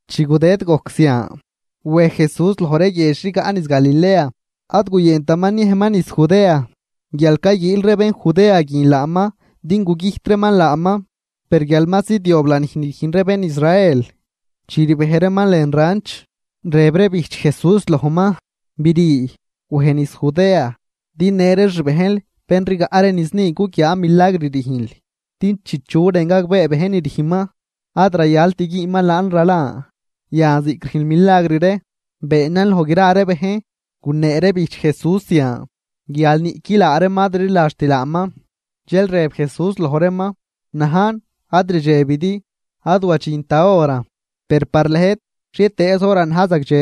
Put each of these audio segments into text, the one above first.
Chi gudëd gojc zian, wej Jesús loj ree guiedx rigaꞌ niz Galilea. Ad guyëntaman niejman niz Judea, guial cayguiil ree bén Judea guin laaman din gugüjt reeman laaman. Per guial ma zidyob lanij ni rüjn ree bén Israel, chi rbej reeman lën ranch, rëb ree bijch Jesús lojman: ―Brii, wej niz Judea, din në ree xbejnl bén rigaꞌ ree niz ni guguiaa milagr rüjnl. Din chi chu rën gagbee bejn ni rüjnman, ad rayalt güünman laan ralan. Yan ziꞌc rüjnl milagr ree, beenan loj gra ree bejn. Gunee ree bijch Jesús zian, guial niꞌqui laa reeman ad rliladxt laaman. Dxel rëb Jesús loj reeman: ―Ad wadxint da horan, per par lëjt xhietëëz horan na̱j zagdxe.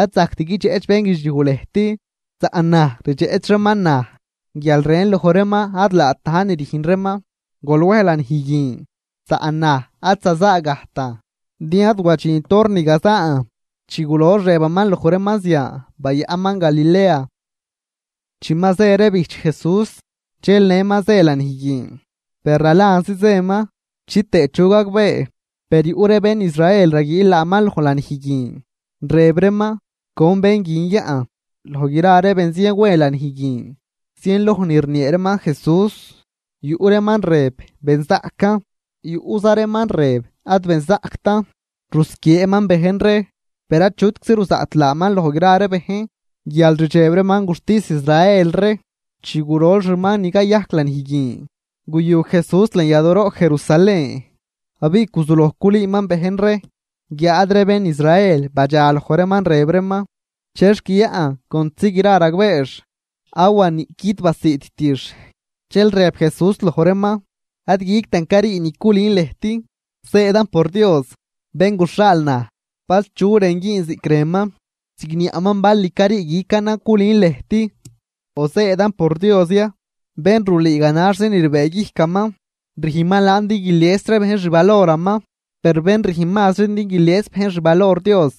Ad zajct guidxeꞌch bénguidxliuj lëjt, saꞌn naj rdxeꞌch reeman naj guial rën loj reeman ad laat na̱j ni rüjn reeman. Gol wej lanij guin, saꞌn naj ad zazaagajtan, din ad wadxint hor ni gazaan. Chi gulox rëbaman loj reeman zian, bayaꞌnman Galilea. Chi ma zë ree bijch Jesús, dxel nëman zë lanij guin, per ralanzi zëman chitëë chu gagbee. Per yuꞌ ree bén Israel raguiil laaman loj lanij guin, rëb reeman: ―¿Con bén guin yaꞌn? Loj gra ree benzien we lanij guin, zienloj ni rniee reeman Jesús. Yuꞌ reeman rëb: “Benzaꞌcan”, yuꞌza reeman rëb: “Ad benzaꞌctan, rusquieeman bejn ree.” Per achutczi ruzaꞌt laaman loj gra bejn, guial rdxeb reeman guxtis Israel ree. Chi gurol xuman ni cayajc lanij guin, guyu Jesús lën yadooroꞌ Jerusalén, abiꞌ guzuloj culüüman bejn ree. Guiáad ree bén Israel badxaloj reeman, rëb reeman: ―¿Chexc yaꞌn contzi gra ragbeex, awa niꞌquid basiidtix? Dxel rëb Jesús loj reeman: ―Ad guictan carii ni culün lëjt, zëëdan por Dios, bén guxhaal naj. Bal chu rën güün ziꞌc rënman, zigniaꞌman bal ni carii guicanan culün lëjt o zëëdan por Dios ya. Bén rulüü ganaxzi ni rbëëguijcaman, rüjnman laan din guilies ree bejn xvaloraman. Per bén rüjn mazri din guilies bejn xvalor Dios,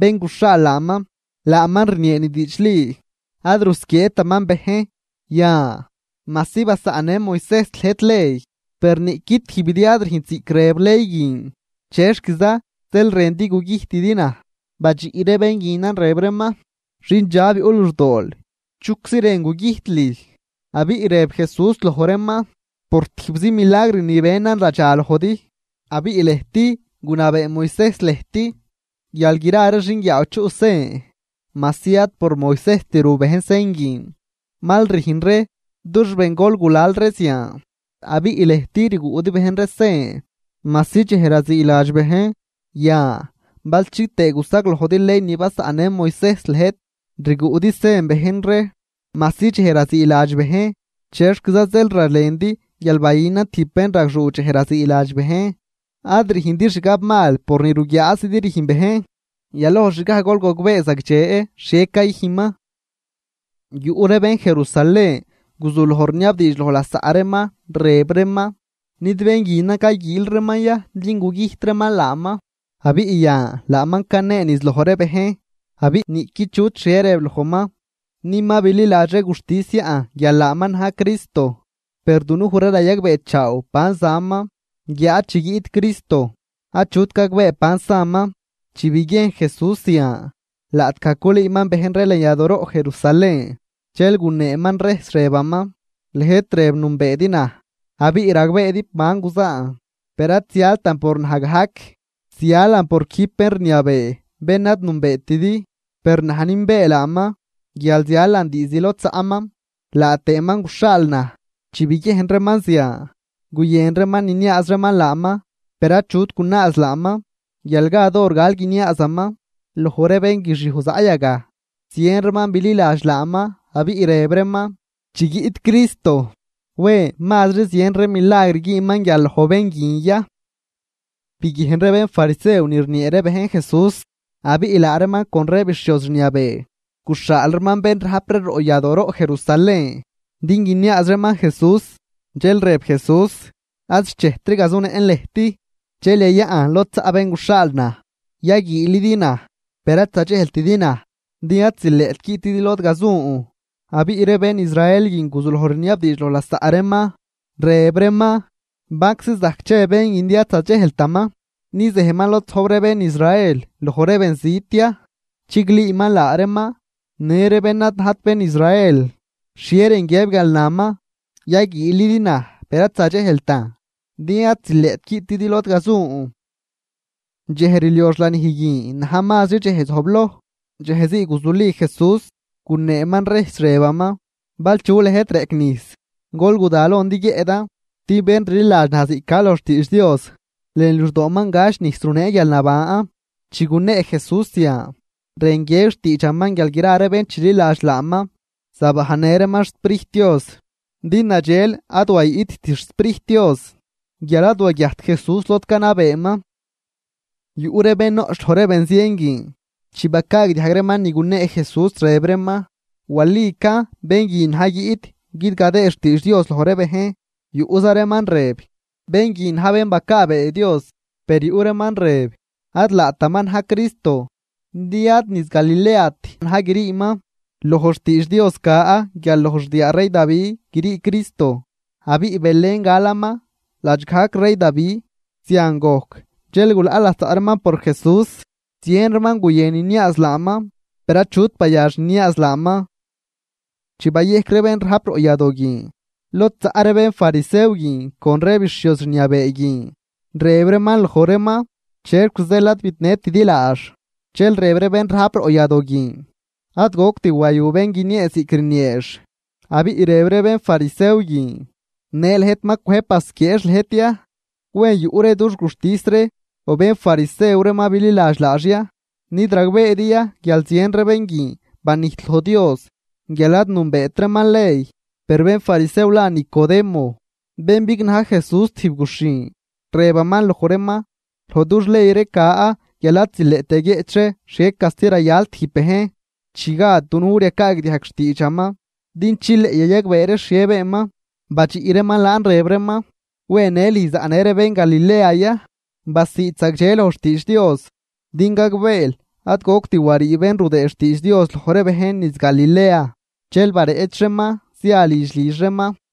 bén guxhaal laaman, laaman rniee ni diidxli, ad rusquieetaman bejn. ’Yan, majsi basaꞌnnë Moisejs lëjt ley, per niꞌqui tijbidi ad rüjnt ziꞌc rëb ley guin. ¿Chexquiza zeel rëndi gugüjtidi naj? Badxiꞌ ree bén guinan, rëb reeman: ―Xindxab yuꞌ luxdool. ¿Chuczi rën gugüjt lüj? Abiꞌ rëb Jesús loj reeman: ―Por tijbzi milagr ni benan radxalojdi. Abiꞌ lëjt gunabee Moisejs lëjt guial gra ree xinguiaaw chuꞌ sen, (majsi ad por Moisejst ru bejn sen guin, mal rüjn ree dux bengol gulal ree zian), abiꞌ lëjt rguꞌdi bejn ree sen, majsi dxej raziiladx bejn. Yan, bal chitëë gusaglojdi ley ni basaꞌnnë Moisejs lëjt, rguꞌdi sen bejn ree majsi dxej raziiladx bejn. ¿Chexquiza zeel ralendi guial bayünan tijb bénragxuu dxej raziiladx bejn? Ad rüjndi xgabmal por ni ruguiaazidi rüjn bejn, yaloj xgaj gol gogbee zagdxe xhie cayüjnman. Yuꞌ ree bén Jerusalén guzuloj rniabdiidx loj lasaꞌ reeman, rëb reeman: ―¿Nid bén guinan cayguiil reeman ya din gugüjt reeman laaman? Abiꞌ yan laaman canee niz loj ree bejn, abiꞌ niꞌqui chut xhie rëb lojman. ¿Ni ma bililadx ree guxtis yaꞌn guial laaman na̱j Cristo? Per dunuj ree rayagbeechaaw ban zaman, guiáad chi guiꞌt Cristo, achut gagbee ban saman. Chi biguiejn Jesús zian, laꞌtgaj culüüman bejn ree lën yadooroꞌ Jerusalén, dxel guneeman rejs rëbaman: ―¡Lëjt rëb nünbeedi naj abiꞌ ragbeedi ban guzaan! Per ad zialtan por naj gajc, zialan por quijb bén rniabee bén ad nünbeetidi. Per naj nünbee laaman guial zialan diizd lod zaꞌman, laa tëëman guxhaal naj. Chi biguiejn reeman zian, guyën reeman niniaaz reeman laaman, per achut gunaaz laaman, guial gad hor gal guiniaazaman. Loj ree bénguixiuj zaꞌ yagaj zien reeman bililadx laaman, abiꞌ rëb reeman: ―Chi guiꞌt Cristo, ¿wen mazri zien ree milagr güünman guial loj bén guin ya? Biguiejn ree bénfarisew ni rniee ree bejn Jesús. Abiꞌ laa reeman con ree bixhioz rniabee, guxhaal reeman bén rajp ree roꞌ yadooroꞌ Jerusalén din guiniaaz reeman Jesús. Dxel rëb Jesús: ―Ad xchejtri gazunëꞌn lëjt, dxel yayaꞌn lod zaꞌ bén guxhaal naj. Yaguiilidi naj, per ad zadxejltidi naj, din ad zileꞌt guiꞌtidi lod gazun. Abiꞌ ree bén Israel guin guzuloj rniabdiidx loj lasaꞌ reeman, rëb reeman: ―¿Banczi zajc che bén guin din ad zadxejltaman? ¿Ni zejman lod zojb ree bén Israel loj ree benzit ya, chiglüüman laa reeman në ree bén ad najt bén Israel? ¿Xhie rën guiëb guial naman: “Yaguiilidi naj per ad zadxejltan, din ad zileꞌt guiꞌtidi lod gazun”? Dxej rliox lanij guin na̱j mazri dxej zojbloj, dxejzii guzuli Jesús guneeman rejs, rëbaman: ―Bal chu lëjt reꞌc nijs, gol guda lon din guiëꞌdan. Din bén rliladx naj ziꞌc ca loj xtiidx Dios, lën luxdooman gach nijs runee guialnaban. Chi gunee Jesús zian, rën guiëb xtiidxaman guial gra ree bén chililadx laaman zabajnnë reeman xSprijt Dios. Din nadxel ad wayiꞌtt xSprijt Dios guial ad waguiajt Jesús lod canabeeman. Yuꞌ ree bén noꞌch loj ree benzien guin, chi bacaagdiajg reeman ni gunee Jesús, rëb reeman: ―Walican, bén guin na̱j guiꞌt guidgadëë xtiidx Dios loj ree bejn. Yuꞌza reeman rëb: ―Bén guin na̱j bén bacaabee Dios. Per yuꞌ reeman rëb: ―Ad laataman na̱j Cristo, din ad niz Galileat na̱j griiman. Loj xtiidx Dios ca guial loj xdiaa rey Davi grii Cristo, abiꞌ Belén galaman ladx gajc rey Davi. Zian gojc dxel gulaꞌ lasaꞌ reeman por Jesús. Zien reeman guyën niniaaz laaman, per achut bayax niniaaz laaman. Chi bayejc ree bén rajp roꞌ yadoo guin lod zaꞌ ree bénfarisew guin con ree bixhioz rniabee guin. Rëb reeman loj reeman: ―¿Chexc zeel ad bidnëtidi laax? Dxel rëb ree bén rajp roꞌ yadoo guin: ―¡Ad goct wayu bén guiniee ziꞌc rnieex! Abiꞌ rëb ree bénfarisew guin: ―¿Në lëjt ma cwëjb basquieex lëjt ya? ¿Wen yuꞌ ree dux guxtis ree, o bénfarisew ree ma bililadx laax ya? ¿Nid ragbeedi ya guial zien ree bén guin banijt loj Dios guial ad nünbeet reeman ley? Per bénfarisew la Nicodemo bén bignaj Jesús tijb guxhin, rëbaman loj reeman: ―Loj dux ley ree ca guial ad zileꞌt yaguieꞌch ree xhie casti rayal tijb bejn, chi gad dunuj ree yacaagdiajg xtiidxaman, din chileꞌ yayagbee ree xhie beenman. Badxiꞌ reeman laan rëb reeman: ―¿Wen në lüj zaꞌnë ree bén Galilea ya? Basiid zagdxe loj xtiidx Dios din gagbeel ad goct warii bén rudëë xtiidx Dios loj ree bejn niz Galilea. Dxel bareꞌch reeman zia lidx lidx reeman.